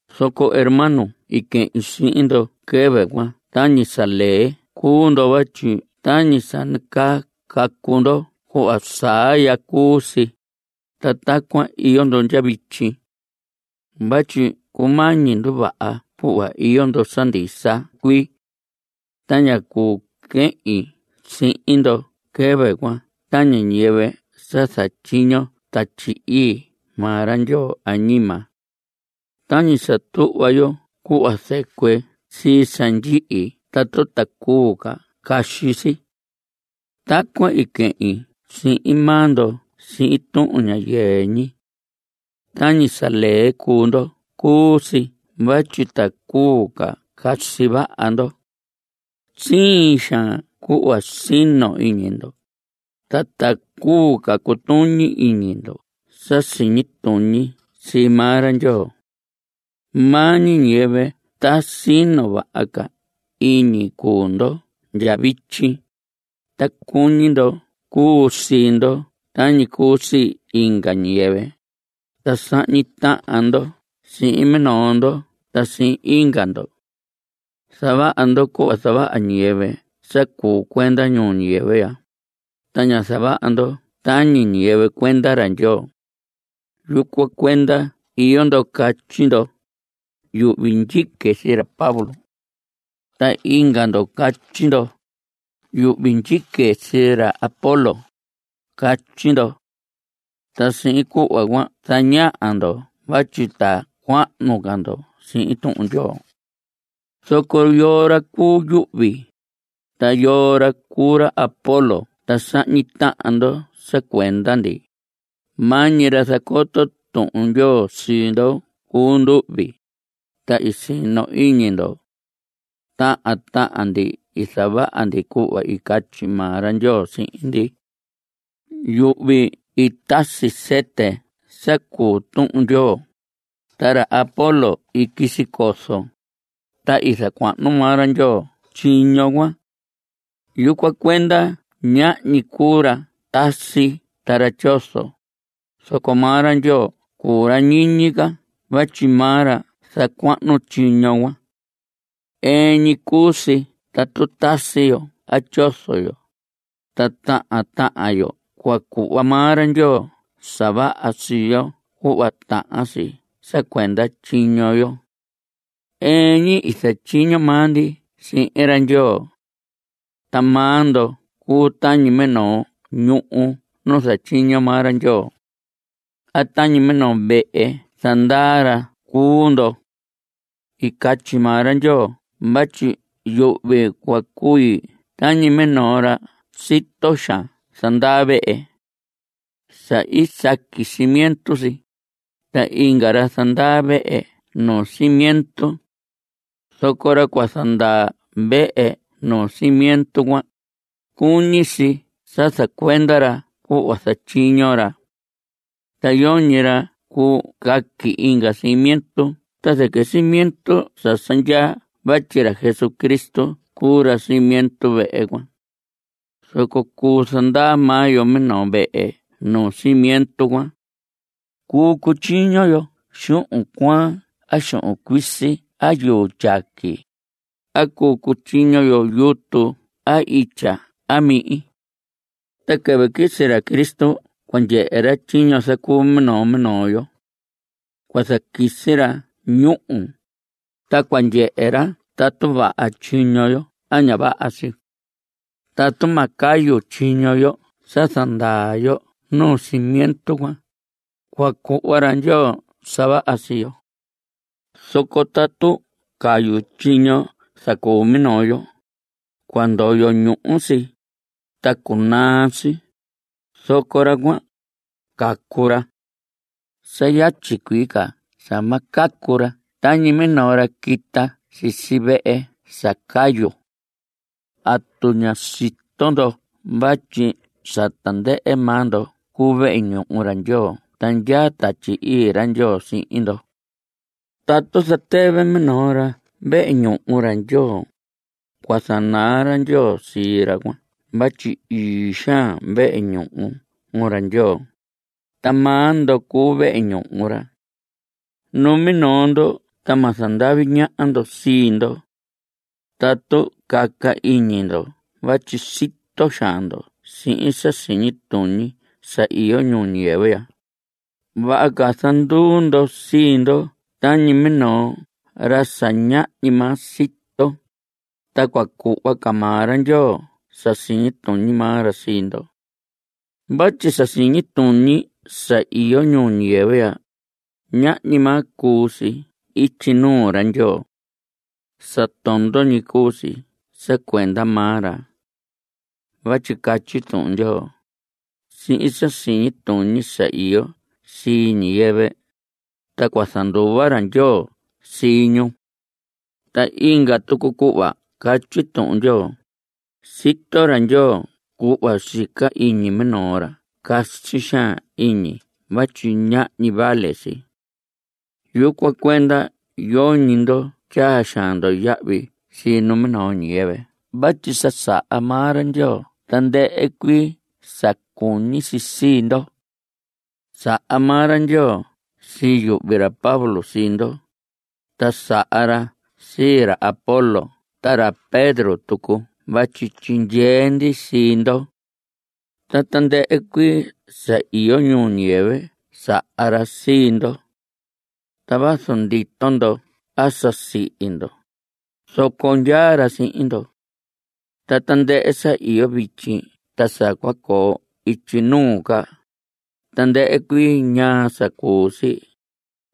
Zoco hermanos i quehin sihin ndo quɨvɨ cuan tañi sa lee cuu ndo vatyi tañi sa nacaa cacu ndo cuhva saa ya cuu si, ta tacuan iyo ndo ndya vityi. Vatyi cumañi nduvaha cuhva iyo ndo sa ndisa cuii. Ta ñá cuu quehin sihin ndo quɨvɨ cuan tañi ñiyɨvɨ sa zatyiño Tatyi Ii maa ra Ndyoo añima. Tañi sa tuhva yo cuhva zɨcuɨ sii sa ndyihi tatu ta cuu ca casi si. Tacuan i quehin sihin maa ndo sihin tuhun ña yɨɨ ñi. Tañi sa lee cuu ndo cuu si vatyi ta cuu ca casi vaha ndo. Siin xaan cuhva sino iñi ndo, ta tacuu ca cutuñi iñi ndo sa siñi tuñi sii maa ra Ndyoo. Maa ñi ñiyɨvɨ ta sino vaha ca iñi cuu ndo ndya vityi, ta cuñi ndo cuu sii ndo tañi cuu sii inga ñiyɨvɨ, ta sahñi tahan ndo sihin minoo ndo ta sihin inga ndo. Zavaha ndo cuhva zavaha ñiyɨvɨ sa cuu cuenda ñuu ñiyɨvɨ ya, ta ña zavaha ndo tañi ñiyɨvɨ cuenda ra Ndyoo. Yucuan cuenda iyo ndo catyi ndo: “Yuhvi ndyique sii ra Pablo.” Ta inga ndo catyi ndo: “Yuhvi ndyique sii ra Apolos.” Catyi ndo. Ta sihin cuhva cuan zañaha ndo vatyi ta cuahnu ca ndo sihin Tuhun Ndyoo. Zoco ¿yoo ra cuu yuhvi? ta ¿yoo ra cuu ra Apolos ta sahñi tahan ndo sa cuenda ndi? Maa ñi ra zacoto Tuhun Ndyoo sii ndo cuu nduhvi, ta i sino iñi ndo. Tahan tahan ndi i zavaha ndi cuhva i catyi maa ra Ndyoo sihin ndi. Yuhvi i tasi sɨtɨ sa cuu Tuhun Ndyoo. Ta ra Apolos i quisi cozo. Ta i zacuahnu maa ra Ndyoo tyiño cuan. Yucuan cuenda ñahñi cuu ra tasi ta ra tyozo, zoco maa ra Ndyoo cuu ra ñiñi ca vatyi maa ra zacuahnu tyiño cuan. Ɨɨn ñi cuu si tatu tasi yo a tyozo yo, ta tahan tahan yo cua cuhva maa ra Ndyoo sa vaha sii yo cuhva tahan si sa cuenda tyiño yo. Ɨɨn ñi i zatyiño maa ndi sihin ra Ndyoo. Ta maa ndo cuu tañi minoo ñuhu nu zatyiño maa ra Ndyoo. A tañi minoo vehe zandaa ra cuu ndo. I catyi maa ra Ndyoo vatyi yuhvi cua cui tañi minoo ra sa sito xaan zandaa vehe. Sa i saqui cimiento si, ta inga ra zandaa vehe nuu cimiento. Zoco ra cua zandaa vehe nuu cimiento cuan, cuñi si sa zacuenda ra cuhva zatyiño ra. Ta yoñi ra cuu caqui inga cimiento ta zɨquɨ cimiento sa sa ndyaa vatyi ra Jesucristo cuu cimiento vehe cuan. Zoco cuu zandaa maa yo minoo vehe nuu cimiento cuan. Cuu cutyiño yo xuhun cuaan a xuhun cuisi a yuu tyaqui. A cuu cutyiño yo yutu a itya a mihin. Ta quɨvɨ quisi ra Cristo cua ndyehe ra tyiño zacuu minoo minoo yo. Cua zaquisi ra ñúhu, ta cua ndyehe ra tatu vaha tyiño yo a ña vaha si. Tatu ma cayu tyiño yo sa zandaa yo nuu cimiento cuan, cua cuhva ra Ndyoo sa vaha sii yo. Zoco tatu cayu tyiño i zacuu minoo yo, cua ndoyo ñuhu si, ta cunaa si, zoco ra cuan, cacu ra. Sa yatyi cuii ca sa ma cacu ra tañi minoo ra quita si vehe sa cayu. ¿Atu ña sito ndo vatyi sa tandɨhɨ maa ndo cuu vehe ñuhu ra Ndyoo ta ndyaa Tatyi Ii ra Ndyoo sihin ndo? Tatu zatɨvɨ minoo ra vehe ñuhu ra Ndyoo, cua zanaa ra Ndyoo sii ra cuan vatyi ii xaan vehe ñuhu ra Ndyoo, ta maa ndo cuu vehe ñuhu ra. Numinoo ndo ta ma zandavi ñaha ndo sii ndo. Tatu caca iñi ndo vatyi sito xaan ndo sihin sa siñi tuñi sa iyo ñuu ñiyɨvɨ ya, vaha ca zanduu ndo sii ndo tañi minoo ra sa ñahñi maa sito, ta cua cuhva ca maa ra Ndyoo sa siñi tuñi maa ra sii ndo. Vatyi sa siñi tuñi sa iyo ñuu ñiyɨvɨ ya, ñahñi maa cuu si ityi nuu ra Ndyoo. Sa tondo ñi cuu si sa cuenda maa ra. Vatyi catyi Tuhun Ndyoo: “Sihin sa siñi tuñi sa iyo sii ñiyɨvɨ, ta cua zanduva ra Ndyoo sii ñu.” Ta inga tucu cuhva catyi Tuhun Ndyoo: “Sito ra Ndyoo cuhva sica iñi minoo ra casi xaan iñi vatyi ñahñi vale si.” Yucuan cuenda yoñi ndo tyaa xaan ndo yahvi sii numinoo ñiyɨvɨ vatyi sa saha maa ra Ndyoo tandɨhɨ cuii sa cuñi si sii ndo. Saha maa ra Ndyoo sii yuhvi ra Pablo sii ndo, ta saha ra sii ra Apolos ta ra Pedro tucu vatyi tyindyee ndi sii ndo. Ta tandɨhɨ cuii sa iyo ñuu ñiyɨvɨ saha ra sii ndo. Ta vazu ndito ndo a sa sihi ndo, zoco ndyaa ra sihin ndo. Ta tandɨhɨ sa iyo vityi ta sa cua coo ityi nuu ca, tandɨhɨ cuii ñaa sa cuu si,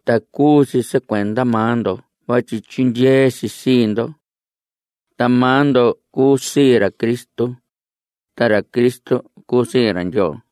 ta cuu si cuenda maa ndo vatyi tyindyee si sii ndo. Ta maa ndo cuu sii ra Cristo, ta ra Cristo cuu sii ra Ndyoo.